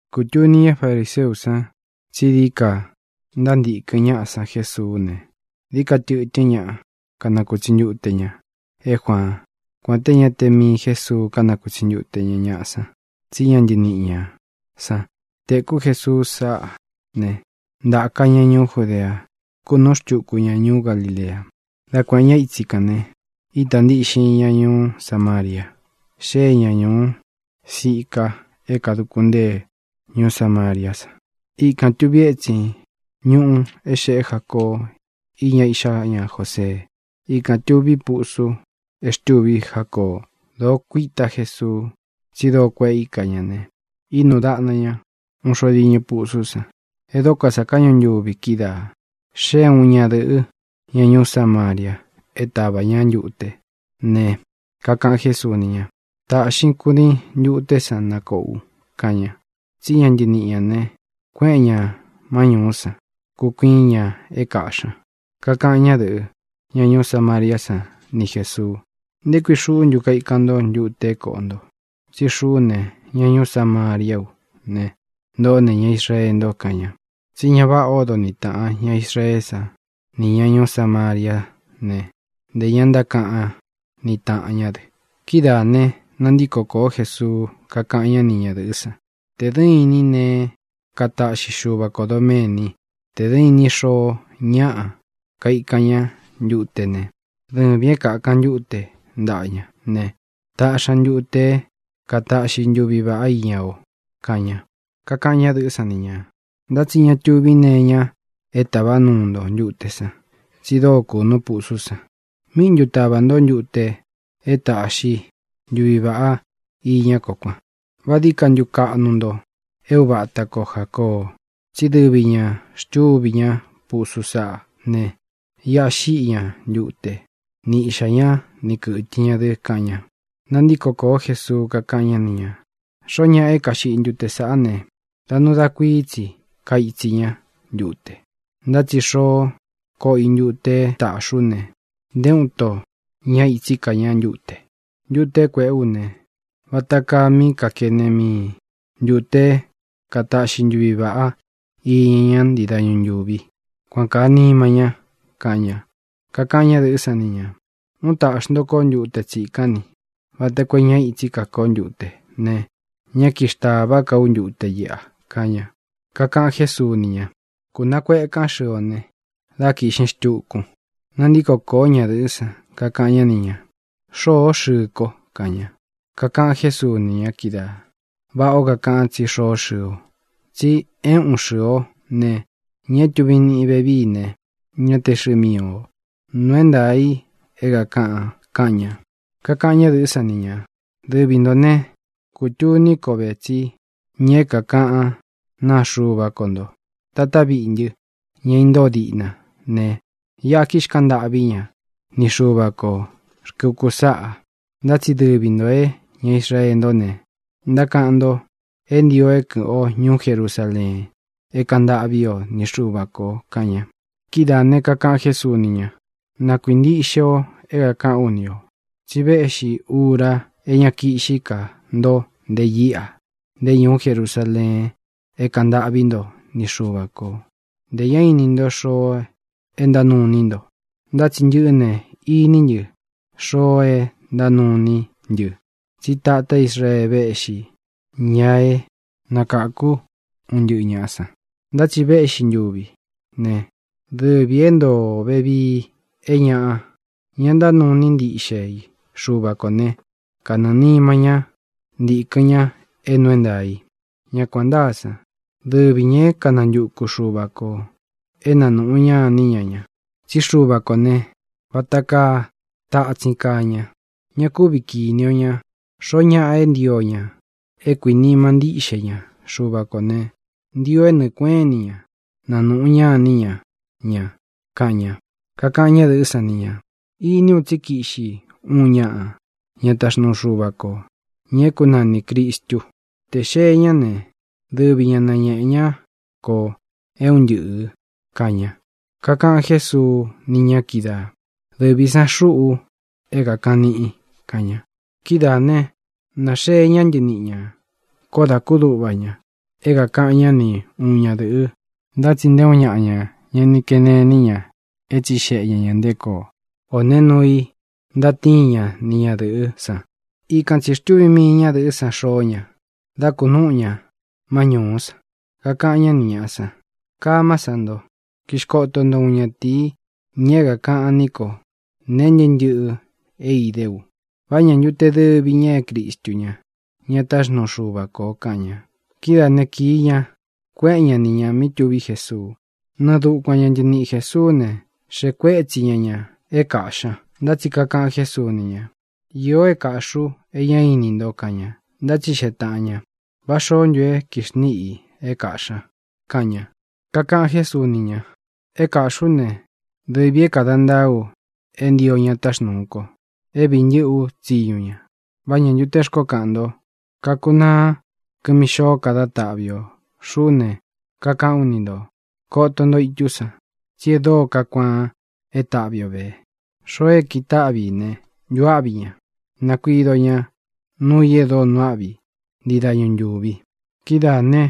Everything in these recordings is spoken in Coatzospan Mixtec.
Kūtuni ñá fariseú san tsí dií ka ntántīkɨn ñaꞌa san Jesuú ne, dií ka tɨtɨ́n ñaꞌa kanakūtsi ntute ña é Juaán; kuān te ñá te mii Jésuu kánakūtsi ntute ñá ñaꞌa san, tsí ña ntɨniꞌi ñā san. Tēkú Jesuu sáꞌa ne, ntāka ña ñuú Judea, kúnūꞌú xtuku ña ñuú Galilea. Dá kuēꞌen ñá itsi kān ne, ítā ntiꞌxin ña ñuú Samaria. Xée ña ñūú Sica é kāduku ntée ñuú Samariá san. Ikān tuvi étsin ñúꞌu é xēꞌé Jacoo íña iꞌxá ña Josee. Ikān tuví pusu é xtûví Jacoo. Dōo kuitá Jesuu, tsí dóo kueꞌe íka ña ne, ínūu daꞌna ña uun xo diñɨ pusú san. E dóko sa káꞌñu ntuvi kídaā. Xée uun ñadɨ̄ꞌɨ́, ña ñuú Samaria, é tavā ñá ntute ne, kakaꞌan Jésuu ni ña: —Tāꞌxin kudiin ntuté san na kōꞌó u —kaꞌan ña. (Tsí ña ntɨniꞌi ñā ne, kuéꞌen ñā má ñūú san, kukuiín ña é kāꞌxí ña.) Kakaꞌan ñádɨ̄ꞌɨ, ña ñuú Samariá san, ni Jēsuu: —¿Nté kui xuꞌú ntu kaikan ntó ntute é kōꞌo nto? Tsí xuꞌú ne, ña ñuú Samariá u ne, ntoꞌó ne, ña Israee nto —kaꞌan ña. (Tsí ñá vāꞌá odo niꞌi tāꞌan ña Israeé san nī ña ñuú Samariá ne, ntē ña ntákaꞌan niꞌi taꞌan ñá dɨ.) Kidáā ne, nantíko kōó Jesuu, kakáꞌan ñá ni ñadɨ̄ꞌɨ́ san: —Tē dɨ́ inin neé kataꞌxi Xúva kō doméni; tē dɨ́ inin xoo ñáꞌa kaikan ñá ntute ne, dɨvīn é kākan ntúte ntaꞌa ña ne, taꞌxi ña ntute é kataꞌxi ntuvi vāꞌá iña o —kaꞌan ña. Kakaꞌan ñádɨ̄ꞌɨ́ san ni ñā: —Ntá tsi ña túvi nee iña é tāvá nuu nto ntute san, tsí dóo kūnu pusú san. ¿Míꞌi ntu tāva nto ntute é taꞌxi ntuvi vāꞌá iña kó kuan? ¿Vá dií ka kaꞌnu ntu nto é uva ata ko Jācoo? Tsí dɨvi ñā xtúvi ña pusú saꞌá ne, iꞌa xíꞌi ña ntute, ni iꞌxā ñá, ni kɨ̄tɨ ña dɨ —kaꞌan ña. Nantíko kōó Jesuu, kakáꞌan ñá ni ñā: —Xoó ñaꞌa é kaxiꞌi ntute sāꞌá ne, da nuu da kuií tsi kaitsi ñá ntute. Ntá tsi tē xoó koꞌo i ntute é tāꞌxí u ne, nté uun ito ñá ītsí ka ña ntute. Ntute é kuēꞌé u ne, vata kaa mí kakene mii ntūte é kataꞌxi ntuvi vāꞌá iña ña ntii dañu ntúvi, kuan kāa nima ña —kaꞌan ña. Kakaꞌan ñádɨ̄ꞌɨ́ san ni ñā: —Ún tāꞌxi nto kó ntute tsikán ni, vata koo é ña itsí ka kó ntute ne, ñá kixtāvá ka ú ntute iꞌa —kaꞌan ña. Kakaꞌan Jésuu ni ña: —Kunakuekán xɨɨ o ne, dá kīꞌxin xtukun. Nantíko kōó ñadɨ̄ꞌɨ́ san, kakaꞌan ñá ni ñā: —Xôó xɨɨ ko —kaꞌan ña. Kakaꞌan Jésuu ni ña kídaā: —Váꞌā ó kakaꞌan tsí xoó xɨɨ o. Tsi é ūꞌun xɨɨ o ne, ña é tuvin niꞌin vevií ne, ñá te xɨɨ mii ō. Nuu é ntaā i é kākaꞌan —kaꞌan ña. Kakaꞌan ñádɨ̄ꞌɨ́ san ni ñā: —Dɨvi ntō ne, kutuní ko ve tsí ña é kākaꞌán naa Xuva ko nto. Tatá viꞌi ntɨ́, ña intóo diꞌna ne, iꞌa kixkaꞌan ntâꞌví ña ni Xuva kō rkɨ ukú saꞌa, ntá tsi dɨvi ntō é ña Israee ntó ne, ntákaꞌan nto é ntio é kɨ̄ꞌɨn o ñuú Jerusaleen é kāꞌan ntâꞌví o ni Xuva kō —kaꞌan ña. Kidáā ne, kakaꞌan Jésuu ni ña: —Na kuīntiꞌxe o é kākaꞌán u ni ō: Tsi véꞌxī ura é ña kiꞌxí ka nto nte íꞌa, nté ñuú Jerusaleen é kaꞌan ntâꞌví nto ni Xuva kō. Ntē ña ini nto xoo é ntánuu iní nto, ntá tsi ntɨꞌɨ́ ne, iní ntɨ xoo é ntánuu iní ntɨ, tsí tatá Israee véꞌxī ña é nakākú un ntɨꞌɨ ñāꞌa san. Ntá tsi véꞌxi ntuvi ne, dɨvī é ntoo ō vevií, é ñaꞌa, ña ntánuu iní ntiꞌxe i Xuva kō né, kanɨɨ̄ nima ñá ntikɨ̄n ña é nuu é ntaā i. Ña kuān ntáa san, dɨvi ñā é kanantuku Xuva kō é nanūꞌu ñá iní ña ña. Tsí Xuva kō ne, vata kaa tatsín kaa ña; ña kúvi kīní o ña. Xoó ñaꞌa é ntio ña é kuīnima ntíꞌxe ña Xuva kō ne, ntio é nɨɨ kueꞌén ini ña nanūꞌu ñá iní ña ña —kaꞌan ña. Kakaꞌan ñádɨ̄ꞌɨ́ san ni ñā: —Ini u tsí kiꞌxi uun ñaꞌa, ña taxnuu Xuva kō, ña é kunanī Cristu. Tē xee ñá ne, dɨvi ña nañēꞌe ñá ko é un ntɨꞌɨ̄ —kaꞌan ña. Kakaꞌan Jésuu ni ña kídaā: —Dɨvī san xuꞌu é kākaꞌan níꞌin —kaꞌan ña. Kidáā ne, naxee ñá ntɨniꞌi ñā. Koó dā kúduꞌva ña é kākaꞌan ñá ni uun ñadɨ̄ꞌɨ. Ntá tsi nté uun ñaꞌa ña ña ni kene iní ña é tsixeꞌe ña ñā nté koo, ō nee núu i ntatíin ña ni ñadɨ̄ꞌɨ́ san. Ikan tsī xtúvi mii ñadɨ̄ꞌɨ́ san xoó ña, dá kūnúꞌu ña má ñūú san, kakaꞌan ñá ni ñāꞌa san: —Kamá san nto, kixkoto nto uun ñatīi, ña é kākaꞌan ní ko nee ntɨ́ꞌɨ ntɨꞌɨ é idé u. ¿Vá ñā ntu te dɨvi ña é Cristu ña, ña táxnuu Xuva kō? —kaꞌan ña. Kidáā né, kīi ña, kueꞌen ñá ni ñā mí tuví Jesuu. Nɨɨ dukuan ña ntɨniꞌi Jēsuú ne, xeꞌe kuétsi ña ñā é kāꞌxi ña. Ntá tsi kakaꞌan Jésuu ni ña: —Īo é kāꞌxí u e ñá ini nto —kaꞌan ña. Ntátsixeꞌe tāꞌan ña: —¿Vá xoó ntu e kíxniꞌi i é kāꞌxí ña? —kaꞌan ña. Kakaꞌan Jésuu ni ña: —É kāꞌxí u ne, dɨvī é kāda ntaa u é ntio ña táxnūu ko, é vīi ntɨ́ꞌɨ ú tsiñu ña. ¿Vá ñā ntu té xkoó kaꞌan nto: “Kakunaá kɨmi xôo dá taꞌvi ō”? Xuꞌú ne, kakaꞌán u ni ntō: Koto nto itú san, tsi e dóo kakuaan é taꞌvi o vē. Xoo é kitaꞌvi i ne, ntuáꞌvi ña; nakuido ña nuu i e dóo nuu áꞌvi i ntii dañu ntūvi. Kidáā ne,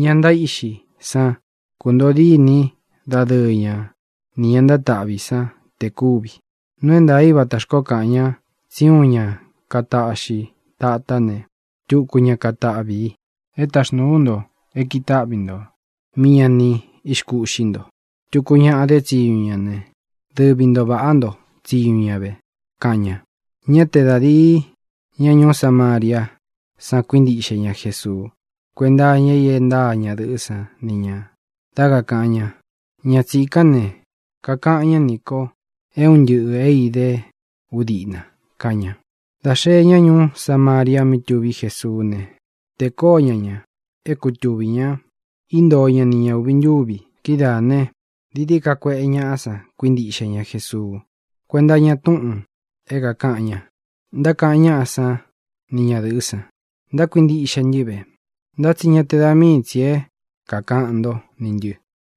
ña ntaíꞌxi san kuntoo díni dadɨɨ ña nī ña ntátaꞌvi san te kúvi. Nuu é ntaā í vata xkoó kaꞌan ña tsí uun ña kataꞌxi tatá ne, tuku ña katáꞌvi i. É taxnūú u nto é kitáꞌvi nto mí ña ni ixkúꞌxi nto. Tuku ñaꞌa dé tsiñu ña ne, dɨvi ntō vaꞌá nto tsiñu ña ve —kaꞌan ña. Ñá te da dīi ña ñuú Samariá san kuíntiꞌxe ña Jesuu kuénta iña i e ntáa ñadɨ̄ꞌɨ́ san ni ñā, dá kakāꞌan ña: “Ña tsīkán ne, kakaꞌan ñá nī ko é un ntɨꞌɨ̄ é idé u diꞌna”, kaꞌan ña. Dā xee ñá ñuú Samaria mí tuví Jesuú ne, tēe koó ña ña é kutuvī ña. Íntoo ña ni ña ūvi ntúvi. Kidáā ne, dií dií ka kueꞌe ñaꞌa san kuíntiꞌxe ña Jesuu kuénta iña túꞌūn é kākaꞌan ña. Ntákaꞌan ñáꞌa sán ni ñadɨ̄ꞌɨ́ san: —Ntákuintiꞌxe ntɨ́ ve, ntá tsi ñá te da mii tsī é kākaꞌan ntó nī ntɨ,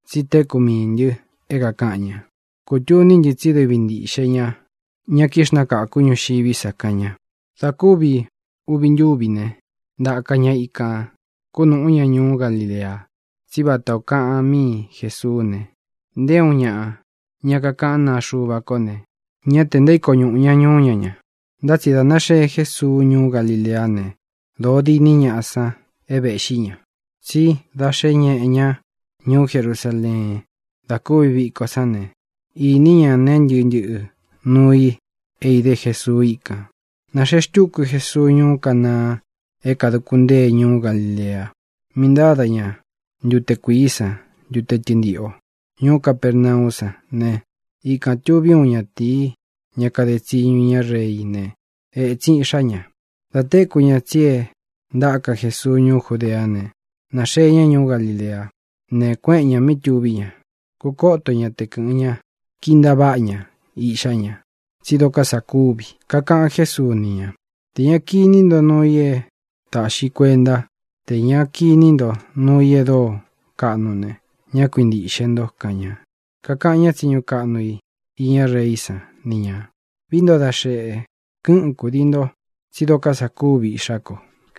tsí téku mií ntɨ é kākaꞌan ña. Kūtuní ntɨ tsí dɨvi ntīꞌxe ña ña kixnákaku ñuxiví sa —kaꞌan ña. Dā kúvi uvi ntúvi ne, ntaka ña ikān, kúnūꞌú ña ñuú Galilea. Tsí vata ō kaꞌan míi Jesuú ne, nté uun ñaꞌa, ña kakaꞌán naa Xuva ko ne, ñá tē ntaíko ñuꞌū ña ñuú ña ña. Ntá tsi dā náxee Jésuu ñuú Galileá ne, dōo diní ñaꞌa san é vēꞌxi ña. Tsí da xé ñeꞌe ña ñuú Jerusaleen da kúvi viko sán ne, īní ña nee ntɨ́ꞌɨ ntɨꞌɨ nuu i é idé Jesuu íkān. Nāxee xtúku Jesuu ñuú Canaa é kāduku ntée ñuú Galilea, mí ntáda ña ntute kuīí san ntute tɨntiꞌo. Ñuú Capernaú san ne, ikān tuvi úun ñatīí, ña kade tsiñu iñá reí ne, ētsin iꞌxá ña. Dā téku ña tsí e ntáka Jesuu ñuú Judeá ne, nāxee ña ñuú Galileá ne, kuéꞌen ñā mí tuví ña, kúkoto ñá te kɨ̄ꞌɨn ñá, kintaváꞌa ña iꞌxá ña, tsí dokó sa kúvi. Kakaꞌan Jésuu ni ña: —Tē ña kiní nto nuu i é tāꞌxi kuentá, tē ña kiní nto nuu i e dóo kaꞌnu ne, ñá kuintīꞌxe nto —kaꞌan ña. Kakaꞌan ñá tsiñu kaꞌnu i iñá reí san ni ñā: —Vií nto da xēꞌe, kɨꞌɨn kúdii nto, tsí dokó sa kúvi iꞌxá ko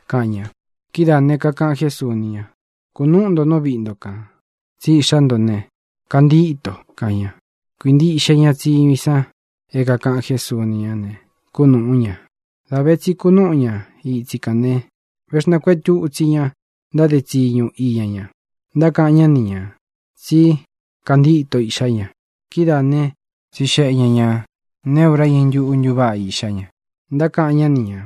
—kaꞌan ña. Kidáā ne, kakaꞌan Jésuu ni ña: —Kunúꞌu nto nú viꞌi nto kān, tsí iꞌxá nto ne, kantíto —kaꞌan ña. Kuīntiꞌxe ña tsiñu i san é kākaꞌan Jésuu ni ñá ne, kúnūꞌú ña. Dā ve tsi kunúꞌu ña itsi kān ne, véxnākuetu itsi ña ntáde tsiñu iña ña. Ntákaꞌan ñá ni ñā tsí kantíto iꞌxá ña. Kidáā né, tsixeꞌe ña ñā neé ura iñɨ ntúꞌu ntuváꞌa iꞌxá ña. Ntákaꞌan ñá ni ñā: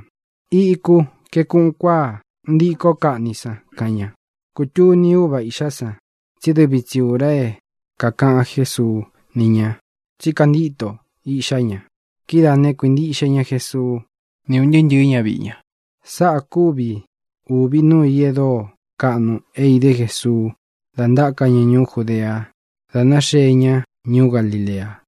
—Iku kaeku uun kuáa ntíko kaꞌni san —kaꞌan ña. Kūtuní uva iꞌxá san tsí dɨvi tsi ūra é kākaꞌan Jésuu ni ña tsí kantíto iꞌxá ña. Kidáā né, kuīntiꞌxe ña Jesuu, ni un ntɨɨ́ ntɨ̄ɨ́ ñaviꞌi ña. Sáꞌa kuvi ūvi núu i e dóo kaꞌnu é idé Jesuu da ntáka ña ñūú Judea, da náxee ña ñuú Galilea.